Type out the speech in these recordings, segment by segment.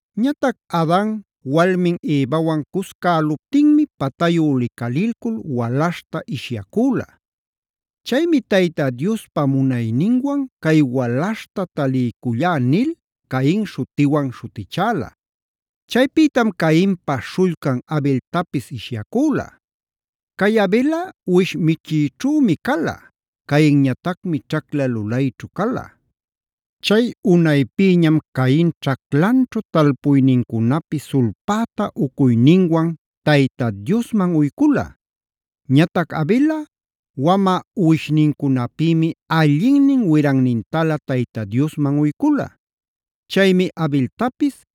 Ñatac Adan walmin Evawan cuscäluptinmi patayu licalilcul walaśhta ishyacüla. Chaymi “Tayta Diospa munayninwan cay walaśhta taliycullá” nil “Cain”a śhutiwan śhutichäla. Chaypïtam Cainpa śhullcan Abeltapis ishyacüla. Cay Abelꞌa uwish michiyćhümi cala. Cainñatacmi ćhacla lulayćhu cala. Chay unaypïñam Cain ćhaclanćhu talpuynincunapi sulpäta ucuyninwan Tayta Diosman uycula. Ñatac Abelꞌa wamä uwishnincunapïmi allinnin wirannintalä Tayta Diosman uycula. Chaymi Abeltapis,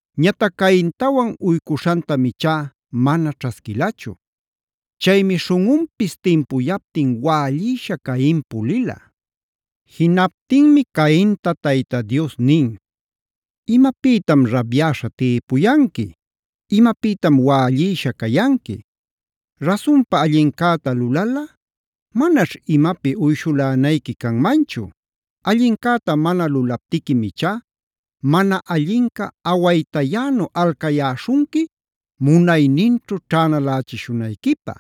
Ñatac Caintawan uycuśhantam ichá mana ćhasquilachu. Chaymi śhunꞌunpis timpuyaptin wällïsha Cain pulila. Jinaptinmi Cainta Tayta Dios nin: “¿Imapïtam rabyäśha tïpuyanqui? ¿Imapïtam wällïsha cayanqui? Rasunpa allincäta lulalꞌa manaćh imapi uyshulänayqui canmanchu. Allincäta mana lulaptiquim ichá mana allinca awaytayänu alcayäśhunqui munayninćhu ćhänalächishunayquipä.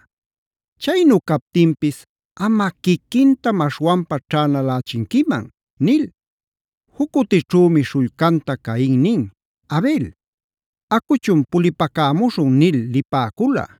Chaynu captinpis amꞌa quiquintam aśhwanpa ćhänalächinquiman” nil. Juc cutićhümi śhullcanta Cain nin: “Abel, acuchun pulipacämuśhun” nil lipäcula.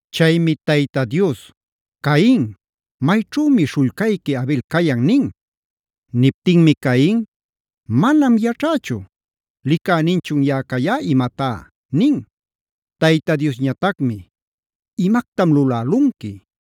Chaymi Tayta Dios: “Cain, ¿mayćhümi śhullcayqui Abel cayan?” nin. Niptinmi Cain: “Manam yaćhächu. ¿Licäninchun yaꞌa cayá imatá?” nin. Tayta Diosñatacmi: “¡Imactam lulälunqui!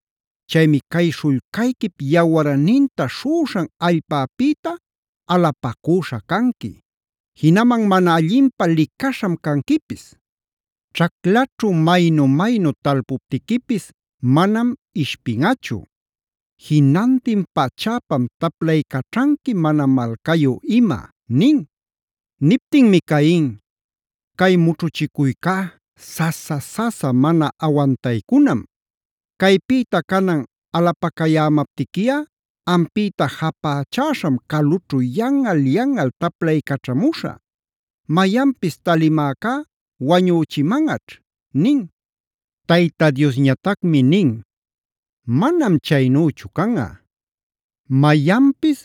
Chaymi cay śhullcayquip yawarninta śhuꞌuśhan allpapïta alapacüśha canqui; jinaman mana allinpä licaśham canquipis. Ćhaclaćhu maynu-maynu talpuptiquipis manam ishpinꞌachu. Jinantin pachäpam taplaycaćhanqui mana malcayu ima” nin. Niptinmi Cain: “Cay mućhuchicuycá sasa-sasa mana awantaycunam. Caypïta canan alapacayämaptiquiꞌa ampïta japächäśham calućhu yanꞌal-yanꞌal taplaycaćhamuśhä. Mayanpis talimäcá wañüchimanꞌaćh” nin. Tayta Diosñatacmi nin: “Manam chaynüchu canꞌa. Mayanpis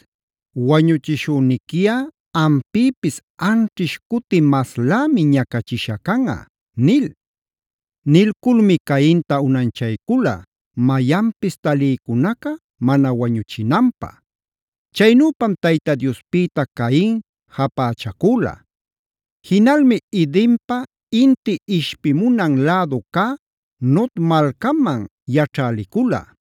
wañuchishüniquiꞌa ampïpis anćhish cuti maslämi ñacachisha canꞌa” nil. Nilculmi Cainta unanchaycula, mayanpis talïcunaca mana wañuchinanpä. Chaynüpam Tayta Diospïta Cain japächacüla. Jinalmi Edenpa inti ishpimunan lädu cä “Nod”e malcaman yaćhä licula.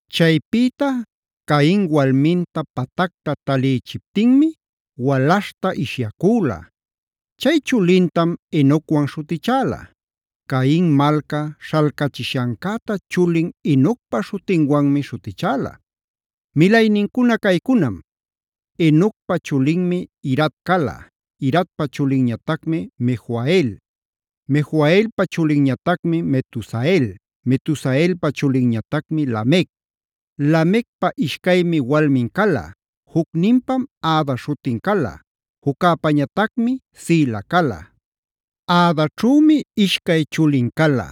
Chaypïta Cain walminta patacta talïchiptinmi walaśhta ishyacüla. Chay chulintam Enocwan śhutichäla. Cain malca śhalcachishancäta chulin Enocpa śhutinwanmi śhutichäla. Milaynincuna caycunam: Enocpa chulinmi Irad cala. Iradpa chulinñatacmi Mejuhael; Mejuhaelpa chulinñatacmi Metusael; Metusaelpa chulinñatacmi Lamec. Lamecpa ishcaymi walmin cala: Jucninpam Ada śhutin cala; juccäpañatacmi Zila cala. Adaćhümi ishcay chulin cala: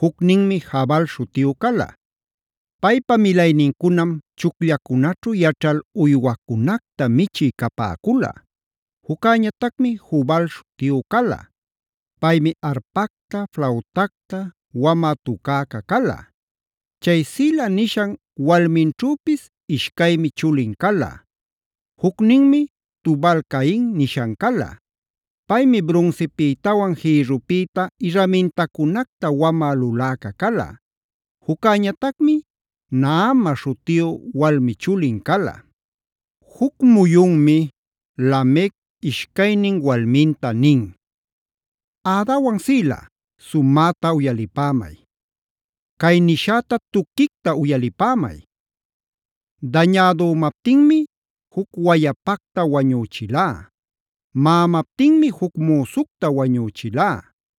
Jucninmi Jabal śhutiyu cala. Paypa milaynincunam chucllacunaćhu yaćhal uywacunacta michï capäcula. Juccäñatacmi Jubal śhutiyu cala. Paymi arpacta, flautacta wamä tucäca cala. Chay Zila nishan walminćhüpis ishcaymi chulin cala: Jucninmi Tubal-cain nishan cala. Paymi brunsipïtawan jïrrupïta irramintacunacta wamä luläca cala. Juccäñatacmi “Naama” śhutiyu walmi chulin cala. Juc muyunmi Lamec ishcaynin walminta nin: “Adawan Zila, sumäta uyalipämay. Cay nishäta tuquicta uyalipämay. Dañädümaptinmi juc wayapacta wañüchilá. Maꞌamaptinmi juc müsucta wañüchilá.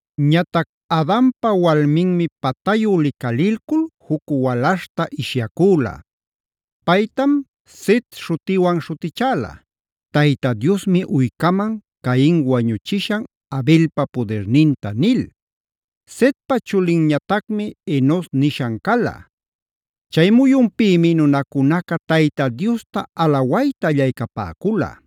Ñatac Adanpa walminmi patayu licalilcul juc walaśhta ishyacüla. Paytam “Set”f śhutiwan śhutichäla: “Tayta Diosmi uycaman Cain wañuchishan Abelpa pudirninta” nil. Setpa chulinñatacmi Enos nishan cala. Chay muyunpïmi nunacunaca Tayta Diosta alawayta allaycapäcula.